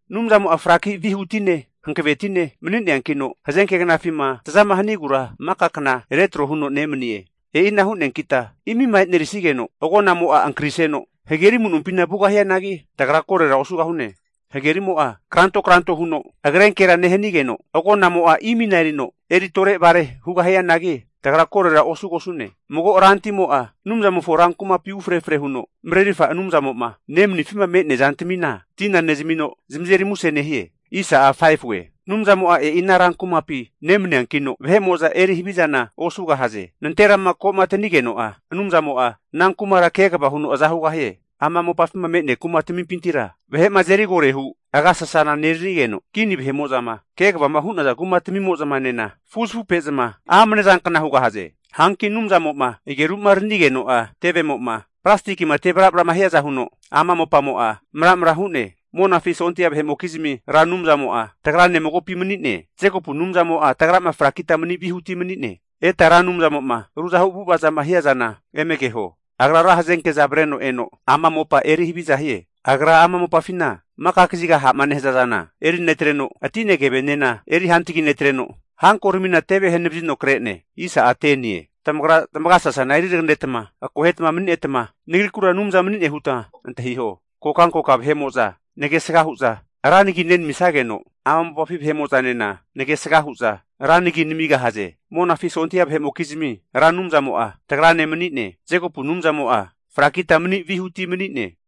Anumzamo'a fraki vihutine hankavetine mani'neankino, hazenke knafima tazama hanigura maka kna retro huno nemanie. E'ina hu'neankita imima e'nerisigeno, agonamo'a ankariseno hageri amu'nompina vugahianagi, tagra korora osugahune. Hagerimo'a kranto kranto huno agrenkera nehanigeno, agonamo'a imina erino eri tore vare hugahianagi, tagra korora osugosune. Mago rantimo'a Anumzamofo rankumapi ufre efre huno Marerirfa Anumzamo'ma nemanifima me'nea zantamina tina zamino zamazeri muse nehie. Anumzamo'a e'i ana rankumapi nemaniankino, vahe'mo'za eri havizana osugahaze. Nanterama komatanigeno'a Anumzamo'a ana kumara kegava huno aza hugahie. Ama mopafima me'nea kumatamimpintira vahe'ma azeri agore hu agasasaneranigeno, kini vahe'mo'zama kegavama hu'naza kumatmimo'zanena fuzafupe'za amane zankna hugahaze. Hanki Anumzamo'ma ageru'ma aranigeno'a, tevemo'ma plastikima temramra'ma hiaza huno ama mopamo'a maramra hu'ne. Monafi sondia vahe'mokizmi Ra Anumzamo'a, tagrane magopi mani'ne. Jekopu Anumzamo'a tagrama frakita mani vihuti mani'ne. Eta Ra Anumzamo'ma ruzahu avu'avazama hiazana eme keho. Agra ra hazenke'za avreno, eno ama mopa eri haviza hie. Agra ama mopafina maka kaziga ha'ma nehaza zana eri netreno, atine, kevenena eri hantagi netreno, hankoramina teve hanavazino kre'ne. Tamagra tamagasasana eri taganeta akoheta mani'neta, Nagrikura Anumza mani'ne huta antahiho. Kokankoka vahe'mo'za nagesga hu'za ra nagi nenamisageno, ama mopafi vahe'mo'zanena nagesga hu'za ra nagi namigahaze. Monafi sondia vahe'mokizmi Ra Anumzamo'a, tagrane mani'ne. Jekopu Anumzamo'a frakita mani vihuti mani'ne.